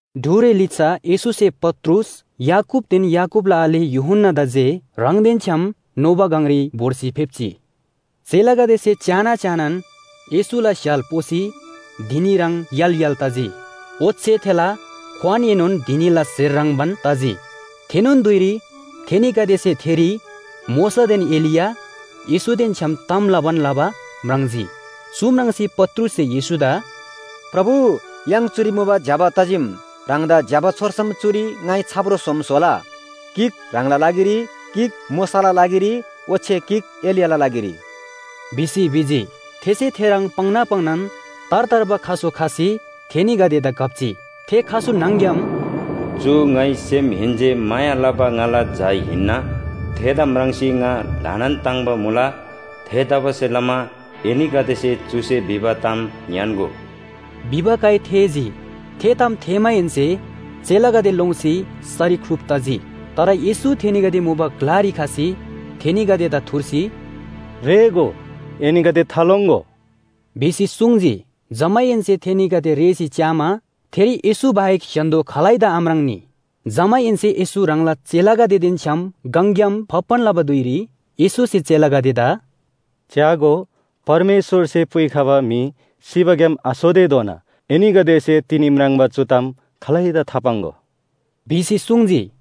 ढुरे लिच्‍छा येशूसे पत्रुस, याकूबदेन याकूबला आले यूहन्‍नादा जे ह्राङदेन छ्‌याम नोबा गङरी भोर्सी फेप्‍जी। चेलागदेसे च्‍याना च्‍यानान येशूला स्‍य्‍हाल पोसी धिनी ह्रङ् य्‍हाल य्‍हाल तजी। ओच्‍छे थेला क्‍वानएनोन धिनीला स्‍हेर ह्रङ्‌बान तजी। थेनोन धुइरी थेनीगदेसे थेरी मोशादेन एलिया, येशूदेन छ्‌याम ताम लबान लबा म्राङ्जी। चु म्राङ्सी पत्रुससे येशूदा “प्रभु, य्‍हाङ चुरी मुबा ज्‍यबा तजीम। ह्राङदा ज्‍यबा छोर्सम चुरी ङाइ छाप्रो सोम स्‍होला, गिक ह्राङला लागिरी, गिक मोशाला लागिरी ओच्‍छे गिक एलियाला लागिरी” भिसी भिजी। थेसे थेह्रङ् पाङ्ना पाङ्नान तार तार्बा खसु खसी थेनीगदेदा घप्‍जी। थे खसु न्‍हङ‍ग्‍याम “चु ङाइ सेमहेन्‍से माया लबा ङाला झा हिन्‍ना, थेदा म्राङ्सी ङा ल्‍हानान ताङ्‍बा मुला। थेतबासेलमा एनीगदेसे चुसे भिबा ताम ङ्‌यान्‍गो” भिबा काइ थेःजी। थे ताम थेःमाहेन्‍से चेलागदे लोङ्सी सरी ख्‍लुप तजी। तर येशू थेनीगदे मुबा ग्‍लारी खसी थेनीगदेदा थुर्सी “रेःगो, एनीगदे थालोङ्‍गो” भिसी सुङ्जी। जमाहेन्‍से थेनीगदे रेःसी च्‍यामा थेरी येशू बाहेक स्‍य्‍हान्‍दो खालैदा आम्राङ्‌नी। जमाहेन्‍से येशू ह्राङला चेलागदेदेन छ्‌याम गङग्‍याम फाप्‍बान लबा धुइरी येशूसे चेलागदेदा “च्‍यागो, परमेश्‍वरसे पुइखबा म्‍हि सिबाग्‍याम आसोतेधोना एनीगदेसे तिनी म्राङ्बा चु ताम खालैदा थापाङ्‍गो” भिसी सुङ्जी।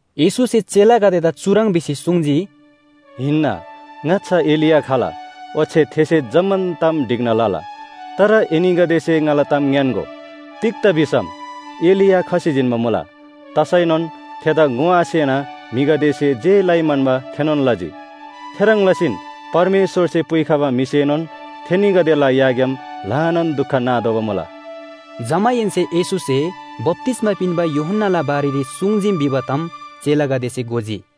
येशूसे चेलागदेदा चुह्रङ् भिसी सुङ्जी, “हिन्‍ना, ङाच्‍छा एलिया खला ओच्‍छे थेसे जम्‍मान ताम ढिक्‍ना लला। तर एनीगदेसे ङाला ताम ङ्‌यान्‍गो, तिग्‍दा भिसम एलिया खसी जिन्‍बा मुला। तसैनोन थेदा ङोआसेना म्‍हिगदेसे जे लइ म्‍हन्‍बा थेनोन लजी। थेह्रङ् लसीन परमेश्‍वरसे पुइखबा म्‍हिसेनोन थेनीगदेला याग्‍याम ल्‍हानान दुख नातोःबा मुला।” जमाहेन्‍से येशूसे बप्‍तिस्‍मा पिन्‍बा यूहन्‍नाला बारेरी सुङ्जीम भिबा ताम चेलागदेसे घोजी।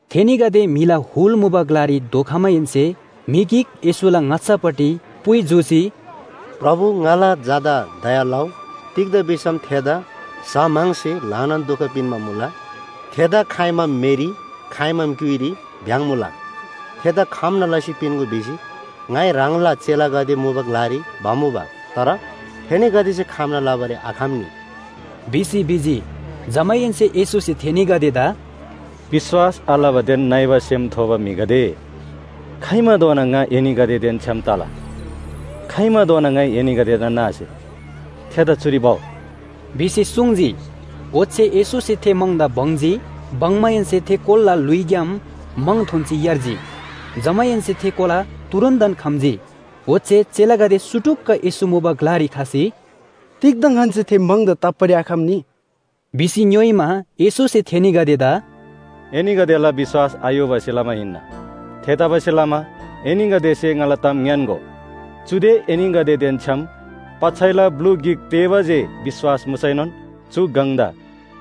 थेनीगदे म्‍हिला हुल मुबा ग्‍लारी धोखमाहेन्‍से म्‍हि गिक येशूला ङाच्‍छापट्टि पुइ जूसी, “प्रभु, ङाला झादा दया लउ, तिग्‍दा भिसम थेदा स्‍ह म्‍हङसे ल्‍हानान दुख पिन्‍बा मुला। थेदा खाइमाम मेरी, खाइमाम क्‍युइरी भ्‍याङ्‍मुला। थेदा खम्‍ना लसी पिन्‍गो भिसी ङाइ ह्राङला चेलागदे मुबा ग्‍लारी भमुबा। तर थेनीगदेसे खम्‍ना लबारी आखम्‍नी” भिसी भिजी। जमाहेन्‍से येशूसे थेनीगदेदा “विश्‍वास आलबादेन नइबा सेम थोबा म्‍हिगदे, खाइमाधोना ङा एनीगदेदेन छ्‌याम तला? खाइमाधोना ङाइ एनीगदेदा नासे? थेदा चुरी भउ” भिसी सुङ्जी। ओच्‍छे येशूसे थे म्‍हङदा बङ्जी। बङ्‍माहेन्‍से थे कोलाला ल्‍हुइग्‍याम म्‍हङ थोन्‍सी यार्जी। जमाहेन्‍से थे कोला तुरुन्‍तन खम्‍जी। ओच्‍छे चेलागदे सुटुक्‍क येशू मुबा ग्‍लारी खसी “तिग्‍दा ङन्‍से थे म्‍हङदा ताप्‍बारी आखम्‍नी” भिसी ङ्‌योइमा, येशूसे थेनीगदेदा “एनीगदेला विश्‍वास आयोबासे लमा हिन्‍ना। थेतबासेलमा एनीगदेसे ङाला ताम ङ्‌यान्‍गो, चुदे एनीगदेदेन छ्‌याम पच्‍छैला ब्‍लु गिक तेःबा जे विश्‍वास मुसैनोन चु गङदा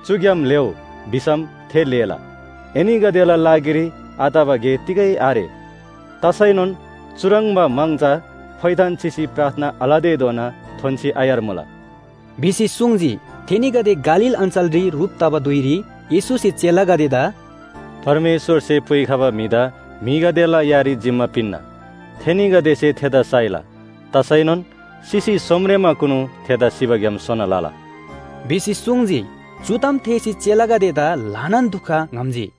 ‘चुग्‍याम लेःउ’ भिसम थे लेःला। एनीगदेला लागिरी आतबा गे तिगै आरे। तसैनोन चुह्रङ्बा म्‍हङ चा फोइथान चिसी प्रार्थना आलतेधोना थोन्‍सी आयार्मुला” भिसी सुङ्जी। थेनीगदे गालील अञ्‍चलरी ह्रुप तबा धुइरी येशूसे चेलागदेदा “परमेश्‍वरसे पुइखबा म्‍हिदा म्‍हिगदेला यारी जिम्‍मा पिन्‍ना। थेनीगदेसे थेदा साइला। तसैनोन सिसी सोमरेमाकुनु थेदा सिबाग्‍याम सोना लला” भिसी सुङ्जी। चु ताम थेःसी चेलागदेदा ल्‍हानान दुख ङ्‌हम्‍जी।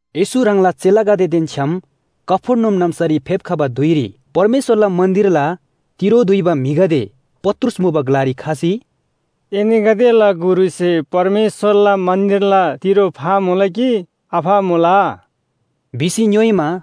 येशू ह्राङला चेलागदेदेन छ्‌याम कफर्नहुम नाम्‍सारी फेप्‍खबा धुइरी परमेश्‍वरला मन्‍दिरला तिरो दुइबा म्‍हिगदे पत्रुस मुबा ग्‍लारी खसी, “एनीगदेला गुरुसे परमेश्‍वरला मन्‍दिरला तिरो फामुला कि आफामुला?” भिसी ङ्‌योइमा,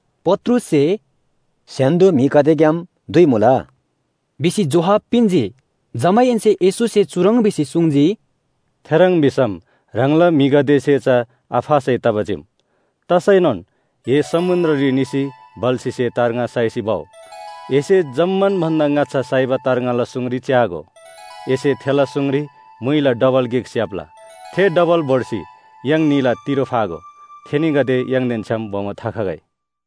पत्रुससे “स्‍य्‍हान्‍दो म्‍हिगदेग्‍याम दुइमुला” भिसी जोहाब पिन्‍जी। जमाहेन्‍से येशूसे चुह्रङ् भिसी सुङ्जी, “थेह्रङ् भिसम ह्राङला म्‍हिगदेसे चा आफासै तबा चीम। तसैनोन ए समुन्‍द्ररी निसी बल्‍छीसे तार्ङा साइसी भउ। एसे जम्‍मान भन्‍दा ङाच्‍छा साइबा तार्ङाला सुङरी च्‍यागो, एसे थेला सुङरी म्‍हुइला डबल गिक स्‍याप्‍ला। थे डबल भोर्सी य्‍हाङ न्‍हीला तिरो फागो। थेनीगदे य्‍हाङदेन छ्‌याम बोमो थाखगै।”